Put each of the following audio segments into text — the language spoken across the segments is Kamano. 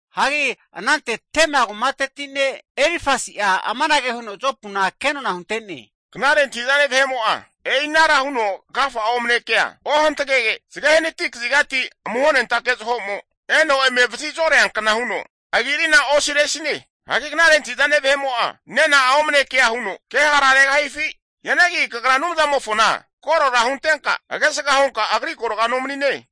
Hagi anante Tema kumateti ne' Elifasi'a amanage huno Jopuna kenona hunte'ne, Knare antahi'zane vahe'mo'a e'inara huno agafa'a omne kea ohantagege, zage hanati kazigati amuhonentake zaho'mo eno eme vazi zoreankna huno agi'arina osiresine. Hagi knare antahi'zane vahe'mo'a nena'a omne kea huno ke hara regahifi? Hianagi kagra Anumzamofona korora huntenka, agesga hunka Agri agorga nomanine.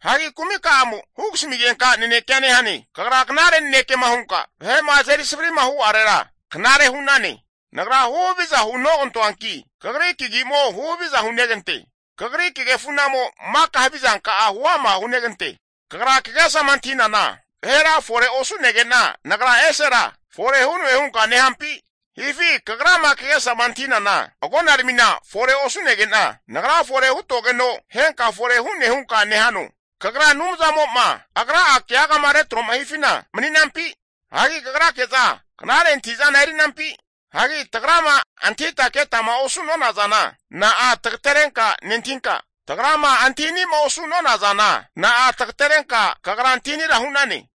Hagi kumika'amo hugasmigenka nanekea nehane. Kagra knare nanekema hunka vahe'ma azeri savri'ma hu'arera knare hu'nane. Nagra huhaviza hunogantoanki, kagri kagi'mo huhaviza hunegante. Kagri kagefu'namo maka havizanka'a huama hunegante. Kagra kagesama antahi'nana, vahera fore osu'nege'na nagra esera fore hu'noe hunka nehampi? Hifi kagrama kagesama antahinana, agonaramina fore osu'nege'na nagra fore hutogeno, henka fore hu'ne hunka nehano? Anumzamo'ma Agra'a keagama retroma hifina kagra mani'nampi? Hagi kagrake'za knare antahi'zana erinampi? Hagi tagrama antahita ketama osu'nona zana, na'a tagaterenka nentahinka, tagrama antahini'ma osu'nona zana, na'a tagaterenka kagra antahinira hu'nane?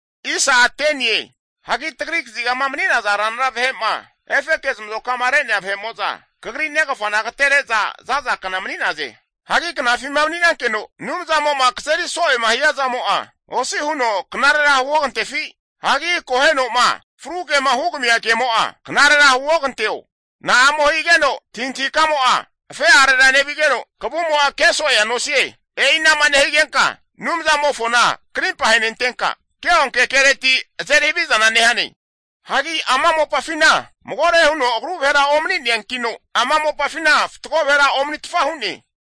Hagi tagri kazigama mani'naza ranra vahe'ma, efeke zamazoka'ma reana vahe'mo'za kagri negafana agatere'za za'zakna mani'naze. Hagi knafima mani'nankeno Anumzamo'ma kazeri so'ema hiazamo'a, osi huno knarera huogantefi? Hagi akoheno'ma fru kema hugamia kemo'a, knarera huoganteo? Na'amo higeno antahintahi kamo'a afe'arera nevigeno, kavumo'a ke so'ea nosie? E'ina'ma nehigenka Anumzamofona krimpa ahenentenka, keonke keretira azeri havizana nehane? Hagi ama mopafina magore huno agru vahera omani'neankino, ama mopafina fatgo vahera omanitfa hu'ne.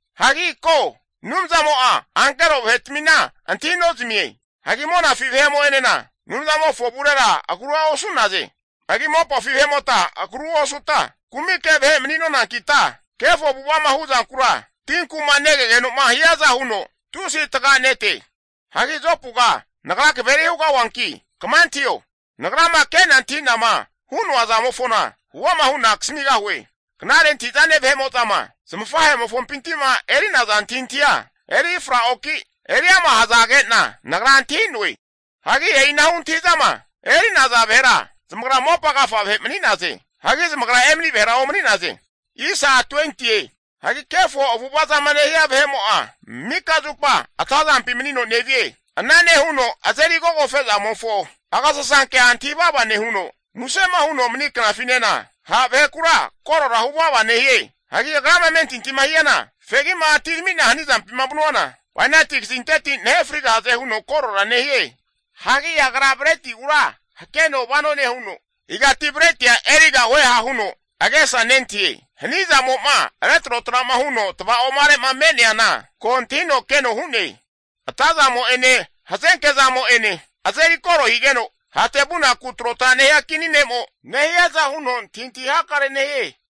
Hagi ko, Anumzamo'a ankero vahetmina antahi nozmie. Hagi monafi vahe'mo'enena Anumzamofo avurera agrua osu'naze. Hagi mopafi vahe'mota agru osuta kumike vahe mani'nonankita, kefo avu'ava'ma hu'zankura tinku'ma ave'nesigeno'ma hiaza huno tusi taga'nete. Hagi Jopuga nagra kaveri hugahuanki, kama antahio. Nagrama ke'na anthi'nama hu'noa zamofona huama hu'na kasamigahue. Knare antahi'zane vahe'mo'zama zamafahe'mofompinti'ma eri'naza antahintahia eri fraoki, eri ama' hazage'na nagra antahi'noe. Hagi e'inahu antahi'zama eri'naza vahera zamagra mopa agafa vahe mani'naze. Hagi zamagra emani vahera omani'naze. Hagi kefo avu'ava zama nehia vahe'mo'a, mika zupa atazampi manino nevie. Ana nehuno azeri agogofe'zamofo agasasankea antahi vava nehuno, musema huno mani knafinena ha' vahekura korora hu vava nehie. Hagi agrama amentintima hiana, fegi'ma atirami'na hanizampima vanuana, bainati kazinteti nahe frigahaze huno korora nehie. Hagi agra bretigura hakeno vano nehuno, igati bretia erigahueha huno agesa nentahie. Hanizamo'ma retrotra'ma huno'ma tava'oma'are'ma me'neana, ko antahino keno hu'ne. Atazamo'ene hazenke zamo'ene azeri koro higeno, hate vunaku trotra nehia kini ne'mo nehiaza huno antahintahi hakare nehie.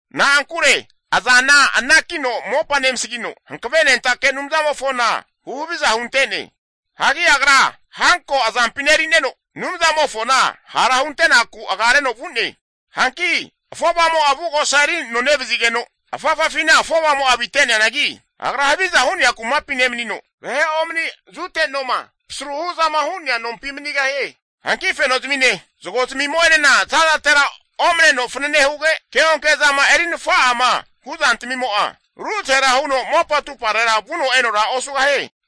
Na'ankure azana anakino mopa nemasagino, Hanavenentake Anumzamofona huhaviza hunte'ne. Hagi agra hanko azampina eri'neno Anumzamofona hara huntenaku agareno vu'ne. Hanki afovamo'a avugosa eri anonevazigeno afafafina afovamo'a avite'neanagi, agra haviza hu'nea kumapi nemanino, vahe omani zute noma pasru hu'zama hu'nea nompi manigahie. Hanki fenozamine zago zmimo'enena zazatera omne fanane huge, keonke zama eri nafa'ama hu'zantmimo'a ruzahera huno mopa atumparera vuno enora osugahie.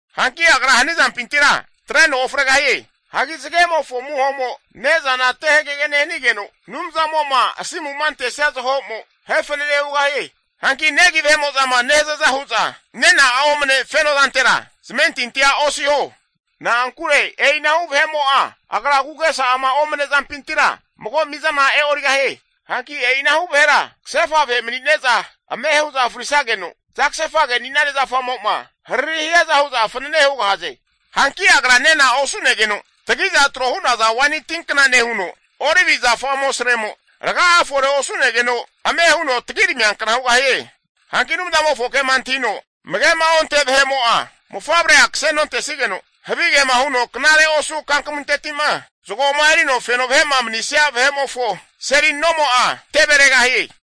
Hanki agra hanizampintira atreno ofregahie. Hagi zagemofo amuhomo ne'zana te hagege nehanigeno, Anumzamo'ma asimu'ma antesia zaho'mo, ahe fanane hugahie. Hanki negi vahe'mo'zama nehazaza hu'za nena'a omne fenozantera zamentintia osiho. Na'ankure e'inahu vahe'mo'a agra agu'agesa'ama omne zampintira mago mizana e'origahie. Hanki e'inahu vahera kasefa vahe mani'neza ame hu'za frisageno, zagasefage ani'nane zafamo'ma hariri hiaza hu'za fanene hugahaze. Hanki agra nena osu'negeno tagi'za tro hu'naza waini tinkna nehuno, olivi zafa amosaremo raga'a fore osu'negeno ame huno tagiramiankna hugahie. Hanki Anumzamofo kema antahino amage'ma onte vahe'mo'a mofavrea kase nontesigeno, havigema huno knare osu kankmunteti'ma zagoma erino feno vahe'ma mani'nesia vahe'mofo seli nomo'a teveregahie.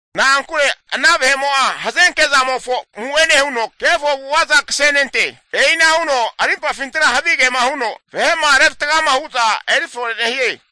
Na'ankure ana vahe'mo'a hazenke zamofo amu'ene huno kefo avu'ava'za kasenente. E'ina huno arimpafintira havigema huno vahe'ma revatgama hu'za erifore nehie.